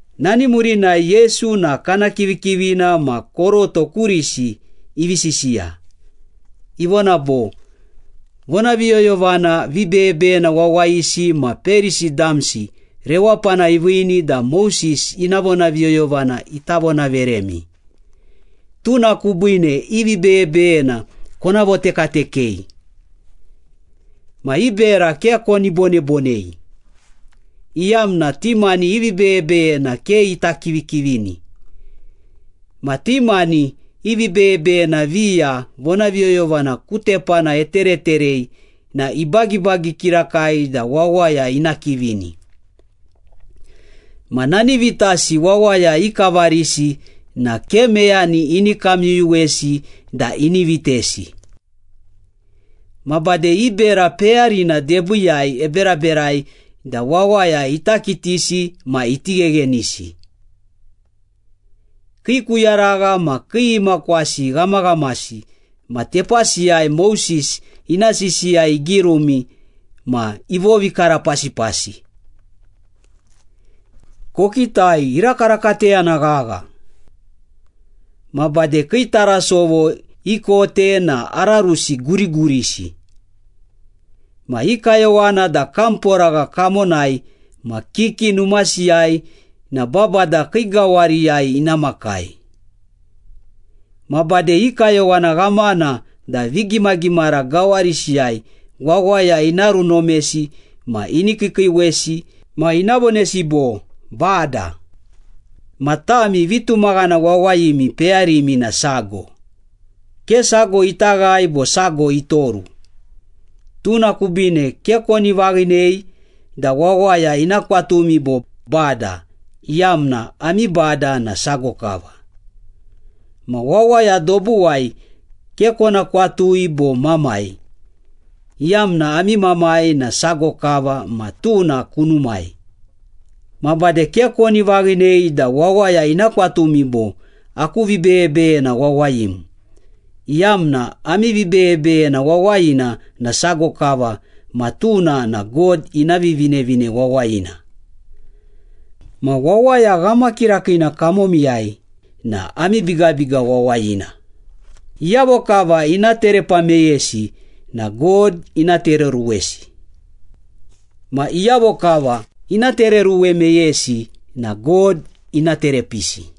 Nani murinai Yesu na kana kivikivina ma koroto kurisi ivi sisiya. Ivona bo, “Vonaviyoyovana vibeyebeyena wawayisi ma Perisi damsi rewapana iviini da Moses ina vonaviyoyovana ita vonaveremi. Tuna kubiine i vibeyebeyena kona votekatekei. Ma i bera ke koni bonebonei, iyamna ti mani i vibeyebeyena ke ita kivikivini. Ma ti mani i vibeyebeyena viya vonaviyoyovana ku tepana etereterei na ibagibagi kirakai da wawaya ina kivini. Ma nani vitasi wawaya ikavarisi na ke meyani ini kamyuyuwesi da ini vitesi. Ma bade i bera peyarina debiiyai eberaberai da wawaya ita kitisi ma iti gheghenisi. Kii kuyaragha ma kii imakwasi ghamaghamasi ma tepasiyai Moses ina sisiya igirumi ma ivovikarapasipasi. Kokitai, irakarakateyana ghagha! Ma bade kii tarasovo ikote na ararusi gurigurisi. Ma i kayowana da kamporagha kamonai ma kiki numasiyai na babada kii gawariyai ina makai. Ma bade i kayowana ghamana da vigimagimara gawarisiyai wawaya ina runomesi ma ini kiikiiwesi ma ina vonesi bo, ‘Bada.’ Ma tami vitumaghana wawayimi peyarimi na sago, ke sago ita ghae bo sago itoru. Tuna kubiine ke koni vaghinei da wawaya ina kwatumi bo ‘Bada’ iyamna ami Bada na sago kava. Ma wawaya dobuwai ke kona kwatui bo ‘Mamai’ iyamna ami Mamai na sago kava ma tuna kunumai. Ma bade ke koni vaghinei da wawaya ina kwatumi bo, ‘Aku vibeyebeyena wawayim’ iyamna ami vibeyebeyena wawayina na sago kava ma tuna na God ina Vivinevine Wawayina. Ma wawaya ghamakirakiina kamomiyai na ami bigabiga wawayina. Iyavo kava ina terepa meyesi na God ina tereoruwesi. Ma iyavo kava ina tereoruwe meyesi na God ina terepiisi.”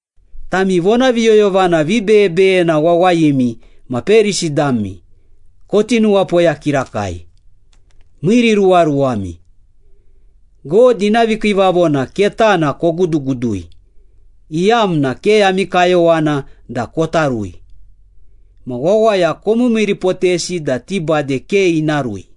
“Tami vonaviyoyovana vibeyebeyena wawayimi ma Perisi dami, koti nuwapoya kirakai! Miiriruwaruwami! God ina vikiivavona ketana kogudugudui, iyamna ke ami kayowana da kota rui. Ma wawaya komiimiiripotesi da ti bade ke ina rui.”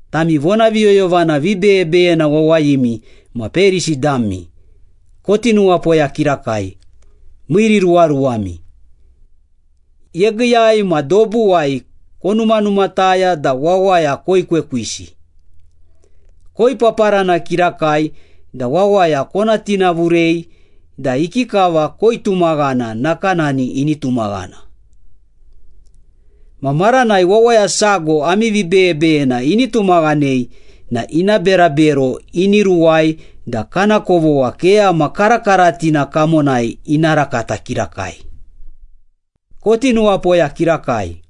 “Tami vonaviyoyovana vibeyebeyena wawayimi ma Perisi dami, koti nuwapoya kirakai! Miiriruwaruwami! Yegiiyai ma dobuwai konumanumataya da wawaya koekwekwisi. Koipaparana kirakai da wawaya kona tinavurei da ikikava koitumaghana nakanani ini tumaghana. Ma maranai wawaya sago ami vibeyebeyena ini tumaghanei na ina berabero ini ruwai da kana kovogha keyama karakaratina kamonai ina rakata kirakai.” “Koti nuwapoya kirakai!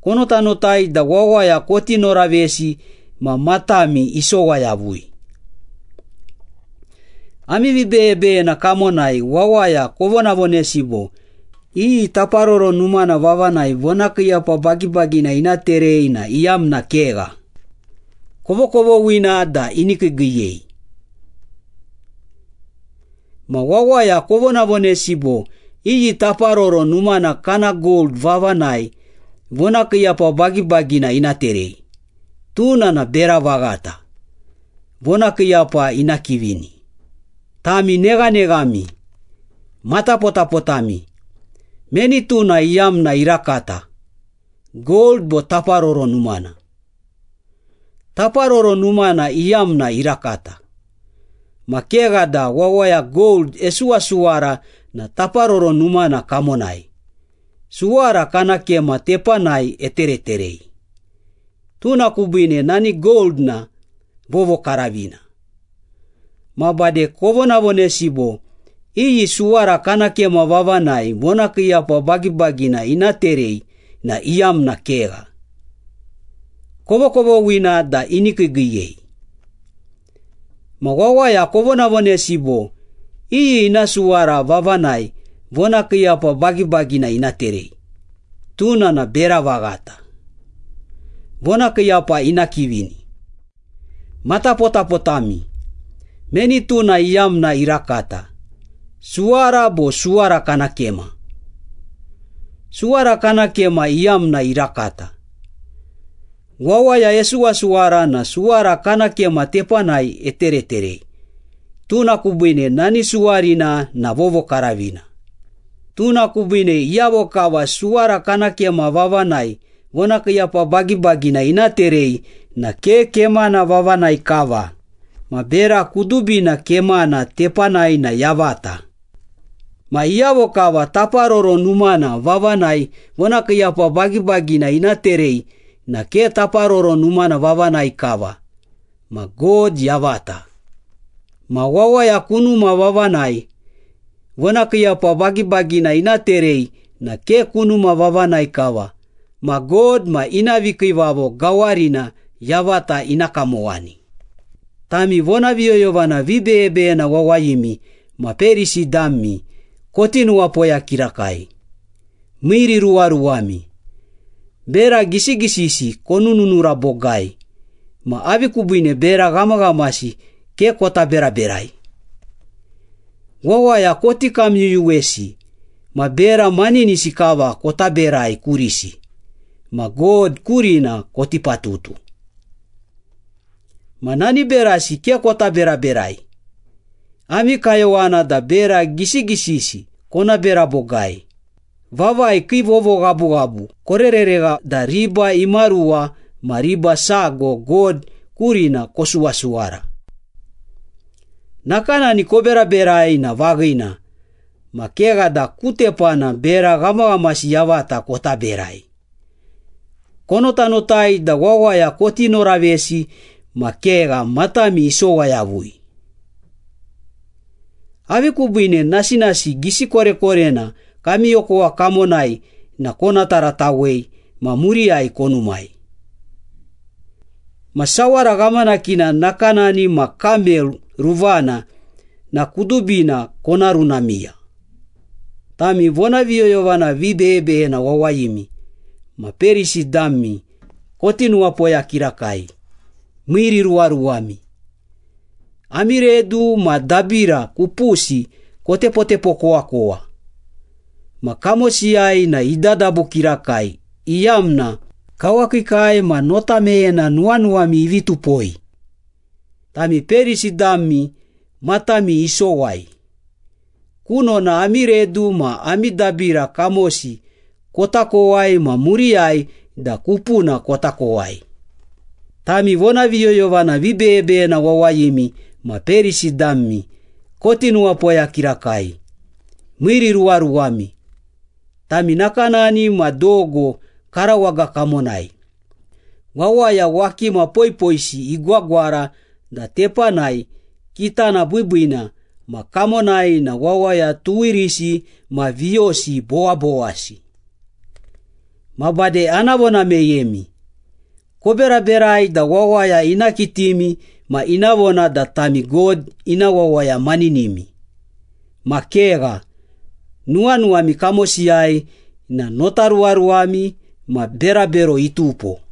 Konotanotai da wawaya koti noravesi ma matami isowa yavui. Ami vibeyebeyena kamonai wawaya kovonavonesi bo, ‘Iyi Taparoro Numana vavanai vonakiiyapa bagibagina ina terei na iyamna kegha, kovokovoghina da ini kiigiiyei.’ Ma wawaya kovonavonesi bo, ‘Iyi Taparoro Numana kana gold vavanai vonakiiyapa bagibagina ina terei, tuna na bera vaghata, vonakiiyapa ina kivini.’ Tami neghaneghami! Matapotapotami! Meni tuna iyamna irakata, gold bo Taparoro Numana? Taparoro Numana iyamna irakata. Ma kegha da wawaya gold esuwasuwara na Taparoro Numana kamonai, suwara kana kema tepanai etereterei, tuna kubiine nani gold na vovokaravina. Ma bade kovonavonesi bo, ‘Iyi suwara kana kema vavanai vonakiiyapa bagibagina ina terei na iyamna kegha, kovokovoghina da ini kiigiiyei.’ Ma wawaya kovonavonesi bo, ‘Iyi ina suwara vavanai vonakiiyapa bagibagina ina terei, tuna na bera vaghata, vonakiiyapa ina kivini.’ Matapotapotami! Meni tuna iyamna irakata, suwara bo suwara kana kema? Suwara kana kema iyamna irakata. Wawaya esuwasuwara na suwara kana kema tepanai etereterei, tuna kubiine nani suwarina na vovokaravina. Tuna kubiine iyavo kava suwara kana kema vavanai vonakiiyapa bagibagina ina terei na ke kemana vavanai kava, ma bera kudubina kemana tepanai na yavata. Ma iyavo kava Taparoro Numana vavanai vonakiiyapa bagibagina ina terei na ke Taparoro Numana vavanai kava, ma God yavata. Ma wawaya kunuma vavanai vonakiiyapa bagibagina ina terei na ke kunuma vavanai kava, ma God ma ina vikiivavo gawarina yavata ina kamowani.” “Tami vonaviyoyovana vibeyebeyena wawayimi ma Perisi dami, koti nuwapoya kirakai! Miiriruwaruwami! Bera gisigisisi konununura bogai, ma avi kubiine bera ghamaghamasi ke kota beraberai? Wawaya koti kamyuyuwesi ma bera maninisi kava kota berai kurisi, ma God kurina koti patutu. Ma nani berasi ke kota beraberai. Ami kayowana da bera gisigisisi kona bera bogai, vavai kii vovoghabughabu korereregha da riba imaruwa ma riba sago God kurina kosuwasuwara. Nakanani koberaberai na vaghina, ma kegha da ku tepana bera ghamaghamasi yavata kota berai. Konotanotai da wawaya koti noravesi ma kegha matami isowa yavui. Avi kubiine nasinasi gisi korekorena kami okowa kamonai na kona taratawei ma muriyai konumai? Ma sawara ghamanakina nakanani ma kamel ruvana na kudubina kona runamiya.” “Tami vonaviyoyovana vibeyebeyena wawayimi ma Perisi dami, koti nuwapoya kirakai! Miiriruwaruwami! Ami redu ma dabira kupusi kotepotepokowakowa, ma kamosiyai na idadabu kirakai iyamna kawakiikai ma nota meyena nuwanuwami ivi tupoi. Tami Perisi dami matami isowai! Kunona ami redu ma ami dabira kamosi kota kowai ma muriyai da kupuna kota kowai.” “Tami vonaviyoyovana vibeyebeyena wawayimi ma Perisi dami, koti nuwapoya kirakai! Miiriruwaruwami! Tami nakanani ma dogo karawaga kamonai, wawaya wakima poipoisi igwagwara da tepanai kitana biibiina ma kamonai na wawaya tuwirisi ma viyosi bowabowasi. Ma bade ana vona meyemi, koberaberai da wawaya ina kitimi ma ina vona da tami God ina wawaya maninimi. Ma kegha, nuwanuwami kamosiyai na notaruwaruwami ma berabero itupo.”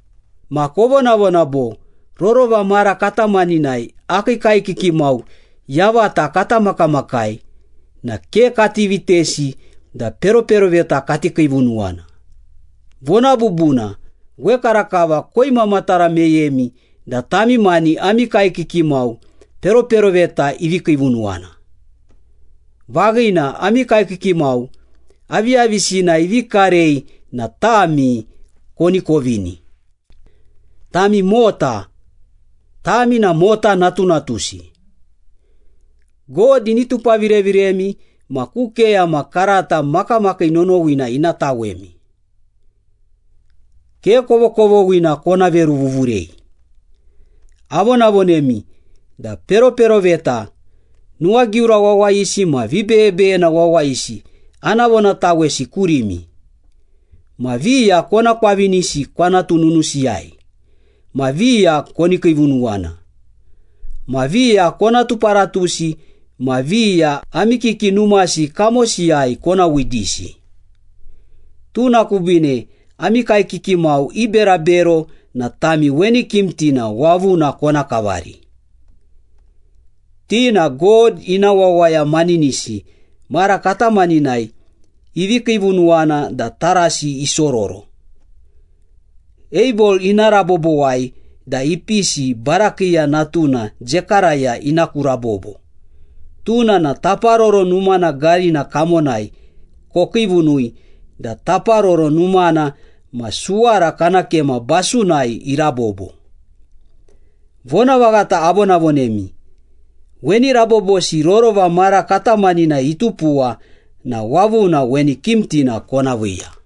Ma kovonavona bo, ‘Rorova mara katamaninai akii kaekiki mau yavata kata makamakai na ke kati vitesi da peroperoveta kati kiivunuwana.’ Vona bubuna, wekarakava koimamatara meyemi da tami mani ami kaekiki mau peroperoveta ivi kiivunuwana. Vaghina, ami kaekiki mau aviyavisina ivi karei na tami koni kovini. Tami mota! Tami na mota natunatusi! God ini tupavireviremi ma ku keyama karata makamakii nonowina ina tawemi! Ke kovokovoghina kona veruvuvurei! Avonavonemi da peroperoveta, nuwagiura wawayisi ma vibeyebeyena wawayisi ana vonatawesi kurimi. Ma viya kona kwavinisi kwanatu nunusiyai, ma viya koni kiivunuwana, ma viya kona tuparatusi ma viya ami kiki numasi kamosiyai kona widisi. Tuna kubiine ami kaekiki mau i berabero na tami weni kimtina wavuna kona kavari. Ti na God ina wawaya manininisi mara katamaninai ivi kiivunuwana da tarasi isororo. Abel ina rabobowai da ipisi Barakiya natuna Zekaraya ina ku rabobo, tuna na Taparoro Numana garina kamonai kokiivunui da Taparoro Numana ma suwara kana kema basunai irabobo. Vonavaghata avonavonemi, weni rabobosi rorova mara katamaninai itupuwa na wavuna weni kimtina kona viiya.”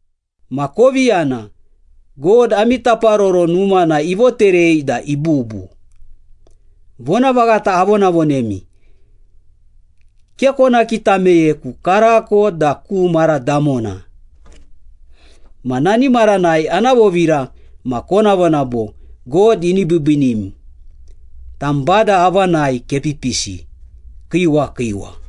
Ma kovi yana, God ami Taparoro Numana ivoterei da ibubu. Vonavaghata avonavonemi, ke kona kita meyeku, karako da ku mara damona. Ma nani maranai ana vovira ma kona vona bo, ‘God ini biibiinim, tam Bada avanai kepipisi! Kiiwa, kiiwa!’”